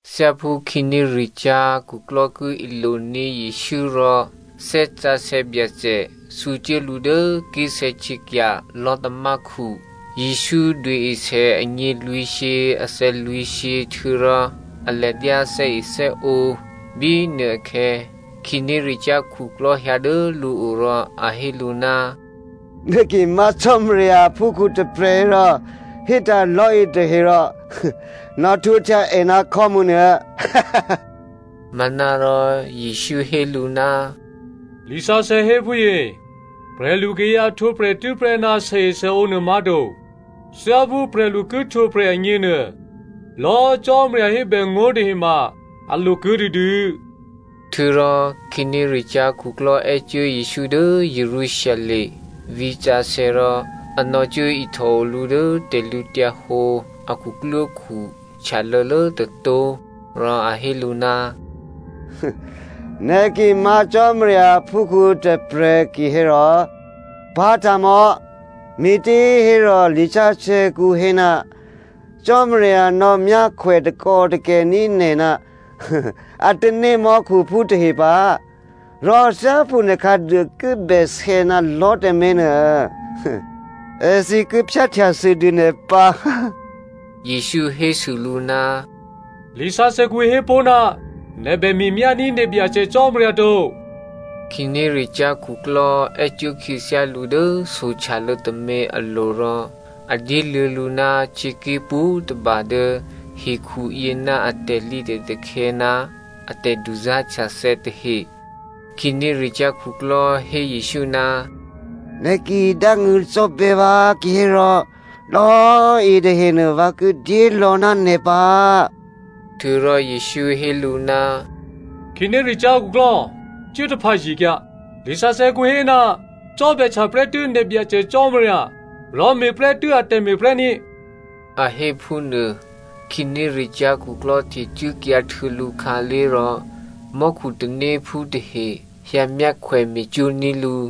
Thyáphú khǐnéricyá̤ khuklò́ ki iloní̤ Jesǔ rò Thè́ Sǎsè̌ Byacè thǔcuố lǔ dố ké̤sè̌htyěkya̤ lò̤́tamákhu. Jesǔ duôesè anyělwǐ̤shyě athè̌lwǐ̤shyě htuô̌rò a ladyá thè́ethè́ǒ. Bínuôakhè̌ khǐnéricyá̤ khuklò́ hyǎ dố lǔo rò a hé lǔ, “Nè̤ ki má̤ Cò́marya aphúkhǔ tôprè̤ hérò, hétǎ̤ lò̤́ yětahe rò nò̌htwǒhtya è ná khò́mǔ nuô.” Manárò Jesǔ hé lǔ, “Lisǎsè̌ héphúyě, ‘Prè̤lukayǎ htwǒprè̤ tû́prè́ ná sèesèǒ nuô má̤to. Thyáphú prè̤lu ki htwǒprè̤ agněnuô, lò̌꤮ Cò́marya hébèngó̤ nuôtahe ma a lo kuô̌ dûdû.’” Htuô̌rò khǐnéricyá̤ khuklò́ è́cuố Jesǔ dố Jerusalem vǐ̤sǎsè̌ rò a nò̌cuốihtòo lǔ dố tè̤lǔhǒdu a khuklwókhu htyalô̌lố tôtó̤. Rò a hé lǔ, “Nè̤ ki má̤ Cò́marya aphúkhǔ tôprè̤ kihérò, pá̤tǎ̤mò̌! Me̤těhérò, lisǎsè̌kǔ hé, ‘Cò́marya nò̌ myákhwè takò́takè̤ní̤ nè̤ ná a tanémò́khuphú tahe pǎ. Rò thyáphú nè̤ khǎduô ki bèsè̌ ná lò̤́ tǎmé̤ nuô, èthǐ ki phyáhtyasûdû nè̤ pǎ.’” Jesǔ hésû lǔ, “Lisǎsè̌kǔ hépó̤, ‘Nè̤ bè me̤myání̤ nè̤ Byacè Cò́marya to.’” Khǐnéricyá̤ khuklò́ è́cuố khyěthyá lǔ dố sohtyalô̌ tômě alo̤ rò a dyéluô̌ lǔ ná htyěké̤ pwǒ̤tôba dố hekhuyě ná a tè̤lǐtè̤takhè̌ ná a tè̤duzá̤htyathè̌ tahe. Khǐnéricyá̤ khuklò́ hé Jesǔ, “Nè̤ ki dángṳ̂cò́bè̌ vǎ kihérò, lò̌꤮ yětahenuô vǎ ki dyélò̌ ná nè̤ pǎ.” Htuô̌rò Jesǔ hé lǔ, “Khǐnéricyá̤ khuklò́꤮! Cuố taphǎye̤kyǎ. Lisǎsè̌kǔ hé, ‘Cò́bè̌htya prè́tû́ nè̤ Byacè Cò́marya rò me̤prè́tû́ ètè̤me̤ prè́ ní,’” a hé phúnuô. Khǐnéricyá̤ khuklò́ htecuốkyǎ htuô̌ lǔkhǎlé̤ rò, mò́khu tanéphú tahe hyǎmyákhwè me̤cwó̤ ní̤ lǔ.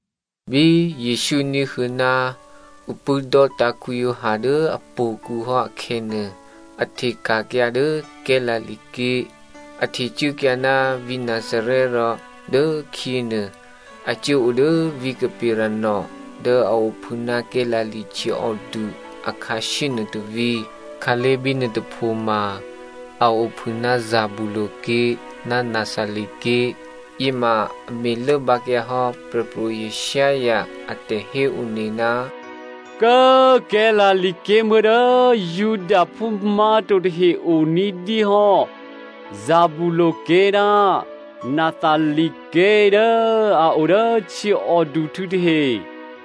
Bí Jesǔ ní̤huô̌ ná ǔ pṳ̂́dò́tǎ̤ Giovanni dố htò̌kǔ hò́ akhè̌nuô, a hteka̤kyǎ dố Galilea ké̤. A htecuốkyǎ ná vǐ̤ Nazarè rò dốkhyěnuô a cuố odố vǐ̤ Capernaum dố a ophû ná Galilea htyěòdu akhǎshyé nuô tôvǐ̤. Khǎlé̤ bínuô tôpho ma a ophû ná Zebulu ké̤ ná Naphtali ké̤. Yěma a me̤lốbǎkyǎ hò́ Prè̤pro̤ Isaiah a tè̤héone, “Kố꤮ Galilea ké̤muố̤ dố Judaphú má̤to tahe o ní̤dyé hò́, Zebulu ké̤ ná Naphtali ké̤, dố a o dố htyěòduhtû̌ tahe,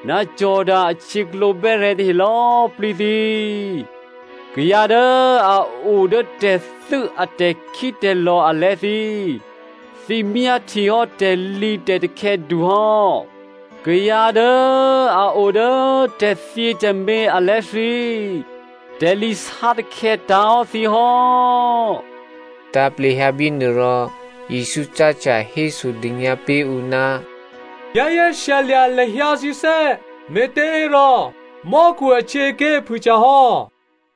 ná Jordano ahtyěklǒ bè́rè̤̌ tahe, lò̌꤮ plǐ thǐ꤮, kayǎ dố a o dố tè̤thû́ a tè̤khítè̤lò̤ alè̤̌ thǐ꤮, thǐ myáhtyehò́ tè̤lǐtè̤takhè̌ du hò́. Kayǎ dố a o dố tè̤thyětè̤mé̤ alè̤̌ thǐ, tè̤lǐ sátakhè̌ tǎ̤hò́ thǐ hò́.” Tǎ̤plehyǎ bínuôrò Jesǔ cáhtya hésodônyǎ pé̤ ǔ, “Za̤ ní̤dû lahyǎ thǐné̤, me̤těhérò mò́khu ahtyěaké̤ phûhtyahò́.”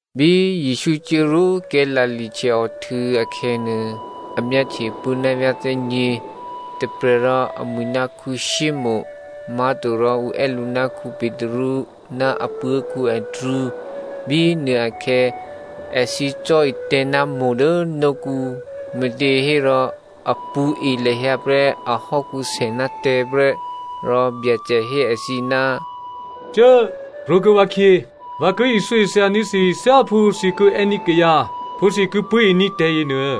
Bí Jesǔ cuốrwó Galilea htyěòhtû̌ akhè̌nuô, a myáhtye puố̤ ná vyá̤ thè́nyě̤. Tôprè̤ rò amwi̤ ná Simonè má̤torò ǔ è́ lǔ ná Petru, ná apuố̤ Andrea. Bínuôakhè̌ èthǐ cò̤́etè̤̌ ná itavǐ dố nókǔ, me̤těhérò a pṳ̌e lahyǎ prè́ ahò́kǔsè ná tè̤̌ prè́. Rò Byacè hé èthǐ, “Cuố꤮ krwǒkuô̌ vǎkhyě. Vǎ ki ithyóithya ní̤ thǐ thyáphú thǐ ki è́ní̤ kayǎ phú thǐ pṳ̂́e ní̤ tè̤̌yě nuô.”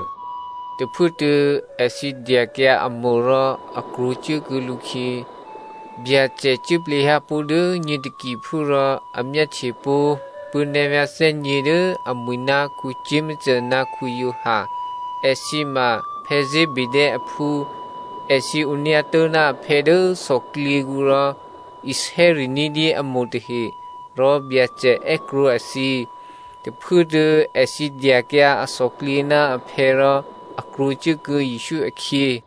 Tôphuốtuô̌ èthǐ dyakyǎ atavǐ rò a krwǒcuốkuô̌ lǔkhyě. Byacè cuốplehyǎ pó̤ dố nyě takiphú rò a myáhtye pó̤ puố̤návyá̤ thè́nyě̤ dố amwi̤ ná Jakomo ná Giovanni. Èthǐ ma Zebedeo aphú. Èthǐ onyǎtố̤ ná aphè̌ dố thòklyěkǔ rò isè́ri̤ ní̤dyé a itavǐ tahe. Rò Byacè è́krwǒ èthǐ. Tôphuốtuô̌ èthǐ dyakyǎ athòklyě ná aphè̌ rò a krwǒcuốkuô̌ Jesǔ akhyě.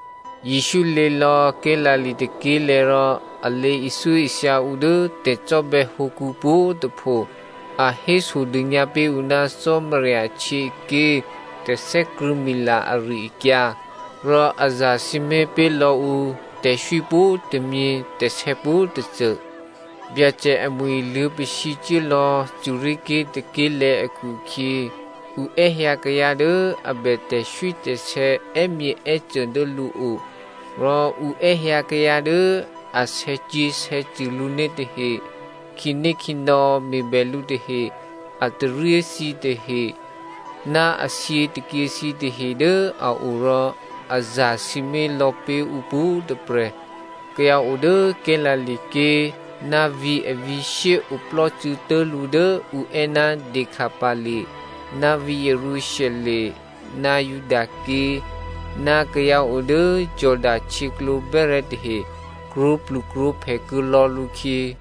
Jesǔ lě lò̌ Galilea tôké̤lè̤̌ rò a lě ithyóithya ǔ dố tè̤cò́bè̌ hǒkǔ pwǒ̤꤮ tôpho. A hésodônyǎ pé̤ ǔ ná Cò́marya ahtyěaké̤ tè̤thè́krṳ̂̌mila ari-akyǎ. Rò a zasǐmé̤ pé̤ lò̌ ǔ tè̤swí pwǒ̤tômyě tè̤sè̌ pwǒ̤tôcô. Byacè amwi̤ luô̌pasǐ cuốlò̌ Syria ké̤ tôké̤꤮ lè̤̌ akhu-akhyě ǔ è́hyǎ kayǎ dố a bè tè̤swítè̤sè̌ è́myěè́cô dố lǔo. Rò ǔ è́hyǎ kayǎ dố a sè̌cyě̤sè̌cṳ̂ lǔné̤ tahe, khǐnékhǐnò̌ me̤bè lǔ tahe, a taryé thǐ tahe, ná a thyětôkyě thǐ tahe dố a o rò a zasǐmé̤ lò̌pé̤ ǔ pwǒ̤꤮ tôprè̤. Kayǎ odố Galilea ké̤, ná vǐ̤ avǐ̤shyé oplò́cû̌ tố̤lǔ dố ǔ è́ ná Decapoli, ná vǐ̤ Jerusalem, ná Judaké̤, ná kayǎ odố Jordano htyěklǒ bè́rè̤̌ tahe krwǒplukrwǒphè kuô̌ lò̌ lǔkhyě.